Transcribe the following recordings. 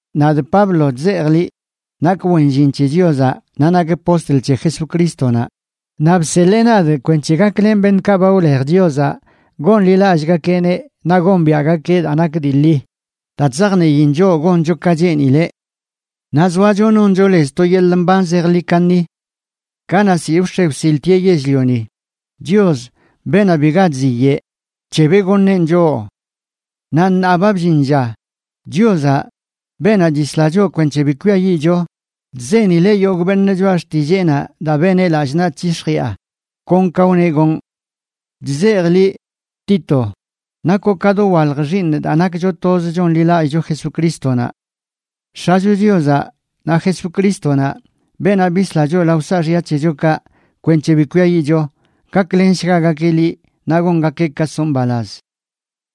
Nadꞌ Pablo chzejꞌ liꞌ, nakꞌ wen llin c̱he Chiozaꞌ naꞌ nakꞌ postl c̱he Jesucrístonaꞌ, naꞌ bseḻee nadꞌ kwenc̱he gaklenꞌ beṉꞌkaꞌ ba wlej Chiozaꞌ gonḻilallꞌgakeꞌneꞌ naꞌ gombiaꞌgakeꞌ daa nak dii ḻi daa chzajniin choꞌ goncho ka cheenileꞌ. Naꞌ zoacho noncho lez to yeḻꞌ mban zejḻi kaṉi. Kanaꞌ ziꞌ wx̱e wsiltieꞌ yell-lioni, Chios, beenaꞌ biga chziyeꞌ, bc̱hebeꞌ goṉeꞌn choꞌ. Naꞌ ṉaa ba bllin lla, Chiozaꞌ, beenaꞌ chisla choꞌ kwenc̱he bi kwiayiꞌcho, chzenileꞌ yogꞌ beṉꞌ choꞌa xtilleenaꞌ daa beneꞌ lallꞌ naꞌ chyix̱jiꞌa, kon ka wneꞌ gonꞌ. Chzejꞌ liꞌ, Tito, nakoꞌ ka dowalj xiiṉꞌ daa nakcho toz chonḻilallꞌcho Jesucrístonaꞌ. X̱acho Chiozaꞌ naꞌ Jesucrístonaꞌ, beenaꞌ bisla choꞌ lao saaxya c̱hechokaꞌ kwenc̱he bi kwiayiꞌcho, gaklenshgagakeꞌ liꞌ naꞌ gongakeꞌ ka soꞌ mbalaz.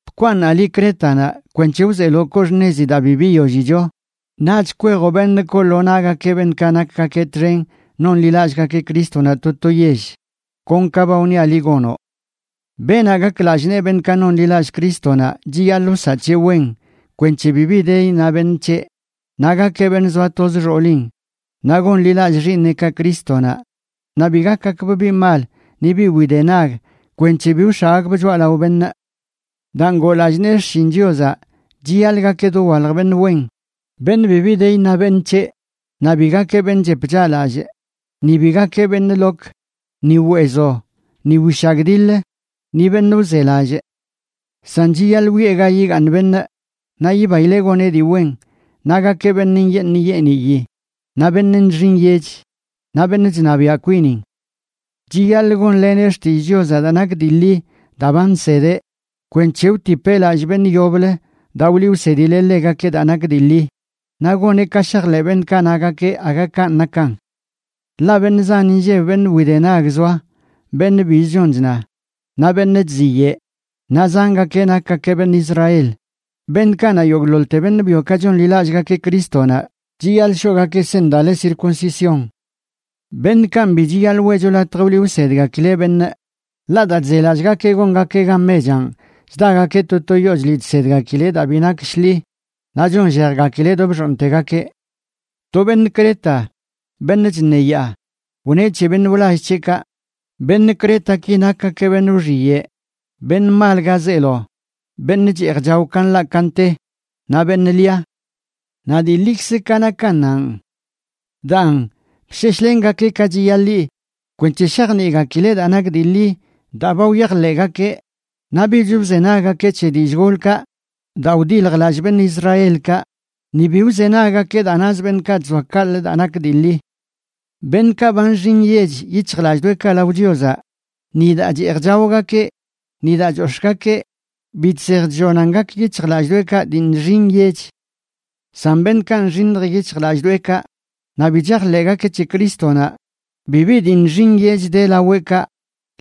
Bkwaaṉaꞌ liꞌ Crétanaꞌ kwenc̱he wzeeloꞌ koo xṉezi daa bi biyollicho, naꞌch kwejoꞌ beṉꞌ koo lo naꞌgakeꞌ beṉꞌkaꞌ nakgakeꞌ txen nonḻilallꞌgakeꞌ Crístonaꞌ to to yell, kon ka ba wniaꞌ liꞌ gonoꞌ. Beenaꞌ gak lallꞌ nee beṉꞌkaꞌ nonḻilallꞌ Crístonaꞌ chiyaḻꞌ wsaꞌ c̱heꞌ wen kwenc̱he bibi de iṉa beṉꞌ c̱heꞌ, naꞌ gakeꞌ beṉꞌ zoa toz xoolin, naꞌ gonḻilallꞌ xiiṉeꞌkaꞌ Crístonaꞌ, naꞌ bi gakgakbꞌ biꞌ mal ni biꞌ widenag kwenc̱he bi wx̱aꞌgakbꞌ choꞌalao beṉꞌ. Daa ngoo lallꞌ nee xshin Chiozaꞌ, chiyaḻꞌ gakeꞌ dowalj beṉꞌ wen, beṉꞌ bibi de iṉa beṉꞌ c̱heꞌ, naꞌ bi gakeꞌ beṉꞌ chep chaꞌlallꞌ, ni bi gakeꞌ beṉꞌ lok, ni weezo, ni wishagdiḻ, ni beṉꞌ wzelallꞌ. San chiyaḻꞌ wiꞌe ga yigaaṉ beṉꞌ, naꞌ yibaileꞌ goneꞌ dii wen, naꞌ gakeꞌ beṉꞌ nyeeṉ nyeeniyi, naꞌ beṉꞌ nxi nyech, naꞌ beṉꞌ chṉabiaꞌ kwinin. Chiyaḻꞌ gonleneꞌ xtillꞌ Chiozaꞌ daa nak dii ḻi daa ba nsedeꞌ, kwenc̱he wtipeꞌ lallꞌ beṉꞌ yoblə daa wliꞌ wsedileꞌ ḻegakeꞌ daa nak dii ḻi, naꞌ goneꞌ ka shajḻeꞌ beṉꞌkaꞌ nagakeꞌ aga kanꞌ nakan. Ḻaꞌ beṉꞌ zan inlleb beṉꞌ widenag zoa, beṉꞌ bizə chon chna, naꞌ beṉꞌ chziyeꞌ, naꞌ zangakeꞌ nakgakeꞌ beṉꞌ Israel, beṉꞌkaꞌ na yogꞌḻoḻte beṉꞌ byokaꞌ chonḻilallꞌgakeꞌ Crístonaꞌ chiyaḻꞌ shoꞌgakeꞌ seṉ daa le circuncisión. Beṉꞌkanꞌ bi chiyaḻꞌ weꞌcho latj wliꞌ wsedgakileꞌ beṉꞌ, ḻaꞌ daa chzelallꞌgakeꞌ gongakeꞌ gan mechanꞌ chdagakeꞌ to to yoo chliꞌ chsedgakileꞌ daa bi nak shḻi, naꞌ chonllejgakileꞌ do bxooṉtegakeꞌ. To beṉꞌ Creta, beṉꞌ chṉeyaa, wneꞌ c̱he beṉꞌ wlall c̱heꞌkaꞌ: “Beṉꞌ Cretaki nakgakeꞌ beṉꞌ wxiyeꞌ, beṉꞌ mal ga zeelo, beṉꞌ cheej chao ka nḻaꞌ ka nte, naꞌ beṉꞌ lia.” Naꞌ dii ḻikzə ka nakannanꞌ. Daan, bsheshlengakeꞌ ka chiyaḻi kwenc̱he shajniꞌgakileꞌ daa nak dii ḻi daa ba wyajḻeꞌgakeꞌ, naꞌ bich wzenaggakeꞌ c̱he dillꞌ golkaꞌ daa wdiljlallꞌ beṉꞌ Israelkaꞌ, ni bi wzenaggakeꞌ daa nazə beṉꞌkaꞌ chzoa kaꞌlə daa nak dii ḻi. Beṉꞌkaꞌ ba nxi nyech yic̱hjlallꞌdoꞌekaꞌ lao Chiozaꞌ, ni daa cheej chaogakeꞌ ni daa chox̱ꞌgakeꞌ bi chsej chllonan gak yic̱hjlallꞌdoꞌekaꞌ dii nxi nyech. San beṉꞌkaꞌ nxiṉj yic̱hjlallꞌdoꞌekaꞌ naꞌ bi chajḻeꞌgakeꞌ c̱he Crístonaꞌ, bibi dii nxi nyech de laweꞌkaꞌ,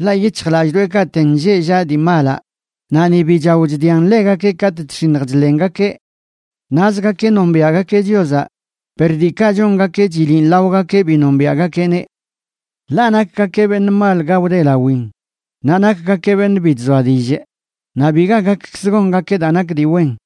ḻaꞌ yic̱hjlallꞌdoꞌekaꞌten lleꞌ llaꞌ dii malaꞌ, naꞌ ni bi chao chdian ḻegakeꞌ katꞌ chx̱iṉj chḻengakeꞌ. Nazgakeꞌ nombiaꞌgakeꞌ Chiozaꞌ, per diikaꞌ chongakeꞌ chiliꞌn laogakeꞌ bi nombiaꞌgakeꞌneꞌ. Ḻaꞌ nakgakeꞌ beṉꞌ mal ga wdelawin, naꞌ nakgakeꞌ beṉꞌ bi chzoa dillꞌ, naꞌ biga gakkzə gongakeꞌ daa nak dii wen.